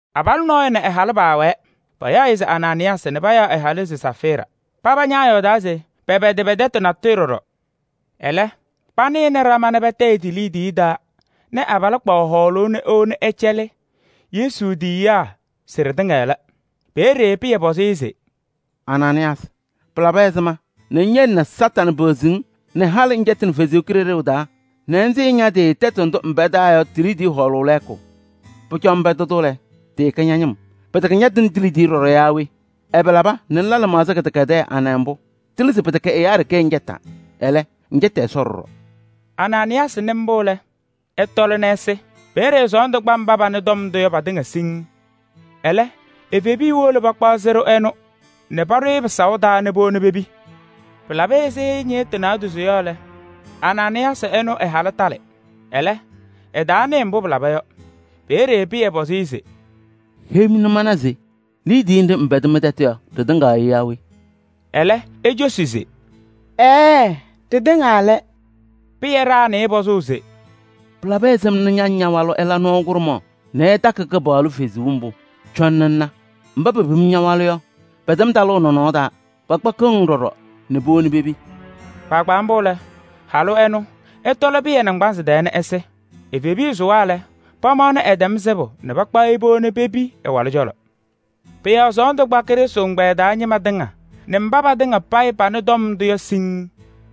Abalʋ nɔɔyʋ nɛ ɛ-halʋ paawɛɛ, payaɣ-ɩ se Anaanɩyaasɩ nɛ ɛ-halʋ se Safɩɩra. Paba ñaayɔɔdaa nɛ pɛpɛdɩ pɛ-tɛtʋ natʋyʋ ɖɔɖɔ. Ɛlɛ, panɩnɩ ɖama nɛ patayɩ ti-liidiye taa nɛ abalʋ kpaɣ hɔɔlʋʋ nɛ ewoni ɛcɛlɩ Yesu tiyiyaa se ɖɩtɩŋa lɛ. Peeye Pɩyɛ pɔzɩ-ɩ se: “Anaanɩyaasɩ! Pɩlabɩ ɛzɩma nɛ ŋyele nɛ Kañadʋ Satanɩ peɣzi-ŋ nɛ halɩ ŋcɛtɩnɩ Ɛsɔ Kalɩzaɣ taa nɛ ŋsɩɩ ña-tɩ tɛtʋ ndʋ ŋpɛdaa yɔ ti-liidiye hɔɔlʋʋ lɛɛkʋ? Pʋcɔ ŋpɛdɩ-tʋ lɛ, tɩɩkɛ ña-ñɩm, pɩtɛkɛ ñatɩnɩ ti-liidiye ɖɔɖɔ yaa we? Ɛbɛ laba nɛ ŋla lɩmaɣza kɩdɛkɛdɛɛ anɛ mbʋ? Tɩlɩ se pɩtɛkɛ ɛyaa ɖeke ŋcɛtaa. Ɛlɛ, ŋcɛtɩ Ɛsɔ ɖɔɖɔ.” Anaanɩyaasɩ nɩ mbʋ lɛ, ɛtɔlɩ nɛ ɛsɩ. Peeye sɔɔndʋ kpa mba panɩ tɔm ndʋ yɔ patɩŋa siŋŋ. Ɛlɛ evebiya wolo pakpaɣ sɩɖʋ ɛnʋ nɛ paɖʋ-ɩ pɩsaʋ taa nɛ powoni-i pepi. Pɩlabɩ ɛzɩ ñɩɣtʋ naadozo yɔ lɛ, Anaanɩyaasɩ ɛnʋ ɛ-halʋ talɩ. Ɛlɛ, ɛtaanɩɩ mbʋ pɩlaba yɔ. Peeye Pɩyɛ pɔzɩ-ɩ se: “Heyi-m nɛ mana se liidiye nɖɩ ɩpɛdɩ mɩ-tɛtʋ yɔ, ɖɩtɩŋa yɔ yaa we?” Ɛlɛ ecosi se: “Ɛɛɛ, ɖɩtɩŋa lɛ.” Pɩyɛ ɖaɣnɩ-ɩ pɔzʋʋ se: “Pɩlabɩ ɛzɩma nɛ ña nɛ ña-walʋ ɩla nɔɔ kʋɖʋmaɣ nɛ ɩtakɩ Kɩpaɣlʋ Kalɩzaɣ mbʋ? Cɔnɩ ŋna! Mba pepim ña-walʋ yɔ, pɛtɛm talʋʋ nɔnɔɔ taa, pakpakɩɣ-ŋ ɖɔɖɔ nɛ powoni pepi.” Kpaagbaa mbʋ lɛ, halʋ ɛnʋ ɛtɔlɩ Pɩyɛ naŋgbanzɩ tɛɛ nɛ ɛsɩ. Evebiya sʋwa lɛ, pamaɣnɩ ɛtɛm sɩbʋ nɛ pakpaɣ-ɩ powoni pepi ɛ-walʋ cɔlɔ. Pʋ-yɔɔ sɔɔndʋ kpa Krɩstʋ ɛgbɛyɛ taa ñɩma tɩŋa nɛ mba patɩŋa payɩ panɩ tɔm ndʋ yɔ siŋŋ.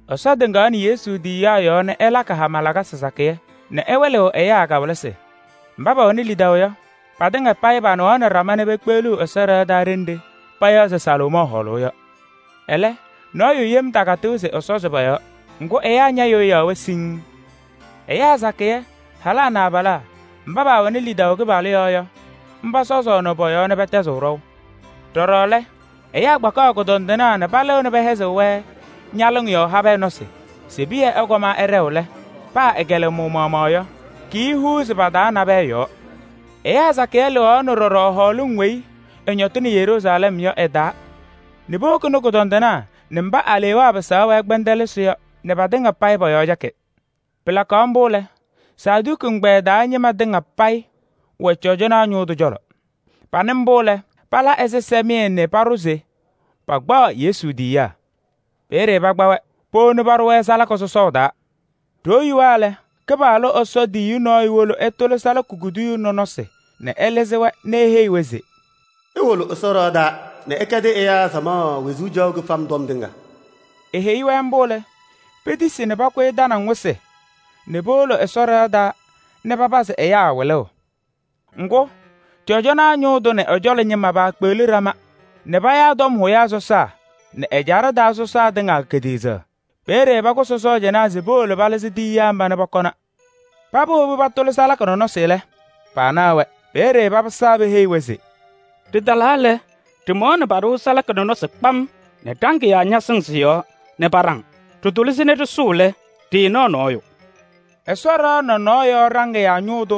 Ɛsɔ tɩŋaɣnɩ Yesu tiyiyaa yɔɔ nɛ ɛlakɩ hama lakasɩ sakɩyɛ nɛ ɛwɩlɩɣ kawɩlɩsɩ ɛyaa hɛkʋ taa. Mba pɛwɛnɩ lidaʋ yɔ, patɩŋa payɩ panɩɣaɣnɩ ɖama nɛ pekpeɣliɣ Ɛsɔ ɖɩɣa taa ɖenɖe payaɣ se Salomɔɔ Hɔɔlʋʋ yɔ. Ɛlɛ, nɔɔyʋ yem takatɩɣ se ɛsɔzɩ pɔ-yɔɔ. Ŋgʋ, ɛyaa ñayɩɣyaɣ-wɛ siŋŋ. Ɛyaa sakɩyɛ: halaa nɛ abalaa mba pɛwɛɣaɣnɩ lidaʋ Kɩpaɣlʋ yɔɔ yɔ, pɔsɔzaɣnɩ pɔ-yɔɔ nɛ pɛtɛzɩɣ ɖɔʋ. Ɖɔɖɔ lɛ, ɛyaa kpakaɣ kʋdɔndɩnaa nɛ palɩɣnɩ pɛhɛzɩɣ-wɛ ñalɩŋ yɔɔ habɛɛ nɔsɩ se Pɩyɛ ɛkɔm ɛɖɛɣ lɛ, paa ɛ-kɩlɛmʋʋ maɣmaɣ yɔ, kiihuuzi pa-taa nabɛyɛ yɔɔ. Ɛyaa sakɩyɛ lɩɣaɣnɩ ɖɔɖɔ hɔɔlɩŋ weyi ɩñɔtɩnɩ Yeruusalɛm yɔ ɩ-taa nɛ powokini kʋdɔndɩnaa nɛ mba alewaa pɩsaɣ-wɛ kpɛndɛlɩsɩ yɔ nɛ patɩŋa payɩ pɔ-yɔɔ cɛkɩ. Pɩlakaɣ mbʋ lɛ, Saduki ɛgbɛyɛ taa ñɩma tɩŋa payɩ wɛ cɔjɔnaa ñʋʋ tʋ cɔlɔ. Panɩ mbʋ lɛ, pala ɛzɩsɛmɩyɛ nɛ paɖʋ se pakpaɣ Yesu tiyiyaa. Peeye pakpa-wɛ powoni paɖʋ-wɛ salaka sɔsɔɔ taa. Ɖoo yuwa lɛ, Kɩpaɣlʋ Ɛsɔ tiyiyu nɔɔyʋ wolo ɛtʋlɩ salaka kuduyuu nɔnɔsɩ nɛ ɛlɩzɩ-wɛ nɛ eheyi-wɛ se: “Iwolo Ɛsɔ ɖɩɣa taa nɛ ɩkɛdɩ ɛyaa samaɣ wezuu caɣʋ kɩfam tɔm tɩŋa.” Eheyi-wɛ mbʋ lɛ, petisi nɛ pakʋyɩ tanaŋ wɩsɩ nɛ powolo Ɛsɔ ɖɩɣa taa nɛ papazɩ ɛyaa wɩlʋʋ. Ŋgʋ, cɔjɔnaa ñʋʋ tʋ nɛ ɛ-cɔlɔ ñɩma paakpeɣli ɖama nɛ payaa tɔm hʋyaa sɔsaa nɛ ɛjaɖɛ taa sɔsaa tɩŋa kediɣzaɣ. Peeye pakʋsɩ sɔɔjanaa se powolo palɩzɩ tiyiyaa mba nɛ pɔkɔna. Paba wobi patʋlɩ salaka nɔnɔsɩ lɛ, paanaɣ-wɛ. Peeye papɩsaa peheyi-wɛ se: “Ɖɩtalaa lɛ, ɖɩmaɣnɩ paɖɩɣ salaka nɔnɔsɩ kpam nɛ ɖaŋɩyaa ñasɩŋ sɩ-yɔɔ nɛ paɖaŋ. Ɖɩtʋlɩ-sɩ nɛ ɖɩsʋʋ lɛ, ɖɩɩnaɣ nɔɔyʋ.” Ɛsɔ ɖɩɣa nɔnɔɔ yɔɔ ɖaŋɩyaa ñʋʋ tʋ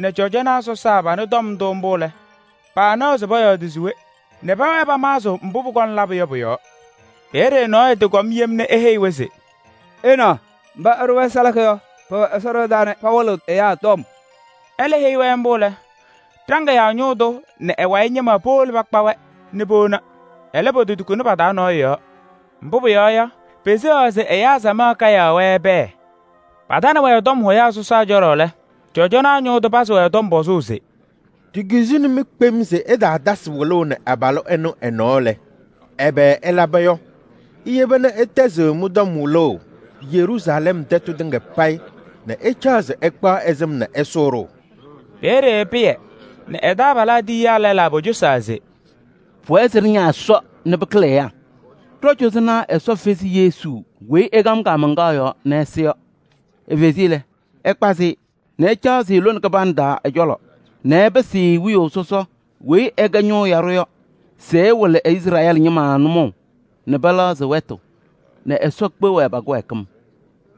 nɛ cɔjɔnaa sɔsaa panɩ tɔm ndʋ mbʋ lɛ, paanaɣ se pɔyɔɔdɩ se we nɛ pɛwɛɛ pamaɣzɩɣ mbʋ pʋkɔŋ labʋ yɔ pʋ-yɔɔ. Peeye nɔɔyʋ tɩkɔm yem nɛ eheyi-wɛ se: “Ɩnaɣ! Mba ɩɖʋ-wɛ salaka yɔ, pɛwɛ Ɛsɔ ɖɩɣa taa nɛ pawɩlɩɣ ɛyaa.” Ɛlɛ heyi-wɛ mbʋ lɛ, ɖaŋɩyaa ñʋʋ tʋ nɛ ɛ-wayɩ ñɩma powolo pakpa-wɛ nɛ powona. Ɛlɛ, pototukuni pa-taa nɔɔyʋ yɔɔ, mbʋ pʋyɔɔ yɔ, peseɣaɣ se ɛyaa samaɣ kayaɣ-wɛ pɛɛ. Patanɩ-wɛ tɔm hʋyaa sɔsaa cɔlɔ lɛ, cɔjɔnaa ñʋʋ tʋ pazɩ-wɛ tɔm pɔzʋʋ se: “Ɖikizini-mɩ kpem se ɩtaatasɩ wɩlʋʋ nɛ abalʋ ɛnʋ ɛ-nɔɔ lɛ, ɛbɛ ɩlaba yɔ? Iyeba nɛ ɩtɛzɩɣ mɩ-tɔm wɩlʋʋ Yeruusalɛm tɛtʋ tɩŋa payɩ nɛ ɩcaɣ se ɩkpaɣ ɛ-sɩm nɛ ɩsʋʋ-ɖʋ!” Peeye Pɩyɛ nɛ ɛ-taabalaa tiyiyaa lɛlaa pocosaa se: “Pʋwɛɛ se ɖɩña Ɛsɔ nɛ pɩkɩlɩ ɛyaa. Ɖɔ-cɔzɔnaa Ɛsɔ fezi Yesu weyi ɩkam kaamaŋkaɣ yɔɔ nɛ ɛsɩ yɔ. Efezi-i lɛ, ɛkpazɩ-ɩ nɛ ɛcaɣzɩ lone kɩbanɖɛ taa ɛ-cɔlɔ nɛ ɛpɩsɩ-ɩ Wiyaʋ Sɔsɔ weyi ɛkɛ Ñʋʋ Yaɖʋ yɔ se ɛwɩlɩ Izrɛɛlɩ ñɩma nʋmɔʋ nɛ pɛlɛɣzɩ wɛtʋ nɛ Ɛsɔ kpeɣ-wɛ pa-kɩwɛɛkɩm.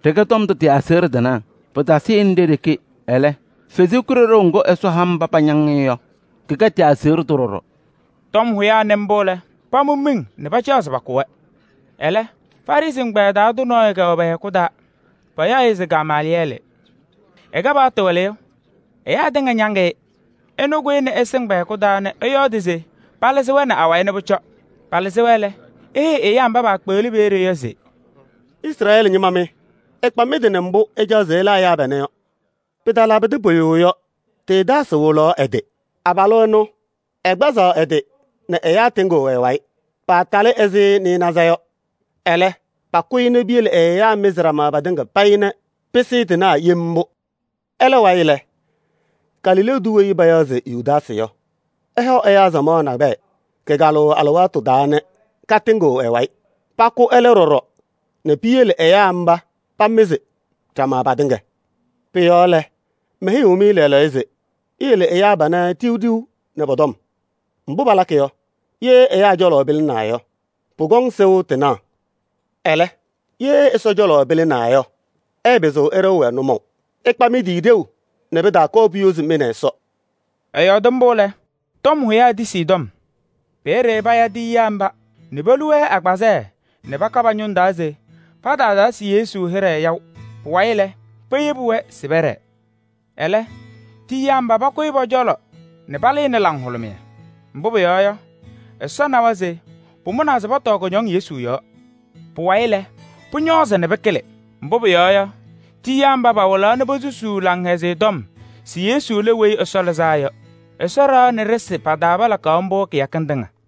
Ɖɩkɛ tɔm ndʋ tɩ-aseɣɖe tɩnaa. Pɩtasɩnɩ ɖe-ɖeke, ɛlɛ, Kalɩzaɣ ŋga Ɛsɔ ha mba pañaŋ-ɩ yɔ, kɛkɛ tɩ-aseɣɖe tʋ ɖɔɖɔ.” Tɔm hʋyaa nɩ mbʋ lɛ, pamʋ miŋ nɛ pacaɣ se pakʋ-wɛ. Ɛlɛ, Farɩsɩ ɛgbɛyɛ taa tʋ nɔɔyʋ kɛwɛ pɛ-hɛkʋ taa, payaɣ-ɩ se Gamaalɩyɛɛlɩ. Ɛkɛ paɣtʋ wɩlɩyʋ, ɛyaa tɩŋa ñaŋ-ɩ. Ɛnʋ kʋyɩnɩ ɛsɩŋ pɛ-hɛkʋ taa nɛ ɛyɔɔdɩ se palɩzɩ-wɛ nɛ awayɩ nɛ pʋcɔ. Palɩzɩ-wɛ lɛ, eheyi ɛyaa mba paakpeɣli peeye yɔ se: “Izrɛɛlɩ ñɩma mɩ! Ɩkpa mɩ-tɩ nɛ mbʋ ɩcaɣ se ɩla ɛyaa panɛ yɔ. Pɩtalabɩdɩ pʋyʋ yɔ, Teedaasɩ wɩlaɣ ɛ-tɩ. Abalʋ ɛnʋ, ɛkpazaɣ ɛ-tɩ nɛ ɛyaa tɩŋɩɣ ɛ-wayɩ, paatalɩ ɛzɩ nasɩnaza yɔ. Ɛlɛ, pakʋ-ɩ nɛ piyele ɛ-ɛyaa mɩzɩ ɖama patɩŋa payɩ nɛ pɩsɩɩ tɩnaɣ yem mbʋ. Ɛlɛ wayɩ lɛ, Galilee tʋ weyi payaɣ se Yudaasɩ yɔ, ɛhɔ ɛyaa samaɣ nakɛyɛ kɩkalʋʋ alɩwaatʋ taa nɛ katɩŋɩɣ ɛ-wayɩ. Pakʋ ɛlɛ ɖɔɖɔ nɛ piyele ɛyaa mba pamɩzɩ ɖama patɩŋa. Pʋ-yɔɔ lɛ, meheyiɣ-mɩ lɛɛlɛɛyɔ se: iyele ɛyaa panɛ ɖiɣ ɖiɣ nɛ pɔ-tɔm. Mbʋ palakɩ yɔ, ye ɛyaa cɔlɔ pɩlɩnaa yɔ, pʋkɔŋ sɩʋ tɩnaɣ. Ɛlɛ, ye Ɛsɔ cɔlɔ pɩlɩnaa yɔ, ɩɩpɩzɩɣ ɩɖɩɣ-wɛ nʋmɔʋ. Ɩkpa mɩ-tɩ ɖeu nɛ pɩtaakɔɔ puyozi mɩ nɛ Ɛsɔ!” Ɛyɔɔdɩ mbʋ lɛ, tɔm hʋyaa tisi ɛ-tɔm. Peeye paya tiyiyaa mba nɛ polu-wɛ agbazɛɛ nɛ paka pa-ñʋŋ taa se pataatasɩ Yesu hɩɖɛ yaʋ. Pʋwayɩ lɛ, peyebi-wɛ se pɛɖɛɛ. Ɛlɛ, tiyiyaa mba pakʋyɩ pɔ-cɔlɔ nɛ palɩnɩ laŋhʋlʋmɩyɛ. Mbʋ pʋyɔɔ yɔ, Ɛsɔ nawa se pamʋnaa se pɔtɔɔ kʋñɔŋ Yesu yɔɔ. Pʋwayɩ lɛ, pʋñɔɔzɩ pɩkɩlɩ. Mbʋ pʋyɔɔ yɔ, tiyiyaa mba pawɩlaɣ nɛ posusuu Laŋhɛzɩyɛ Tɔm se Yesu lɛ Weyi Ɛsɔ Lɩzaa Yɔ. Ɛsɔ ɖɩɣa nɛ ɖɩsɩ pa-taa palakaɣ mbʋ kɩyakɩŋ tɩŋa.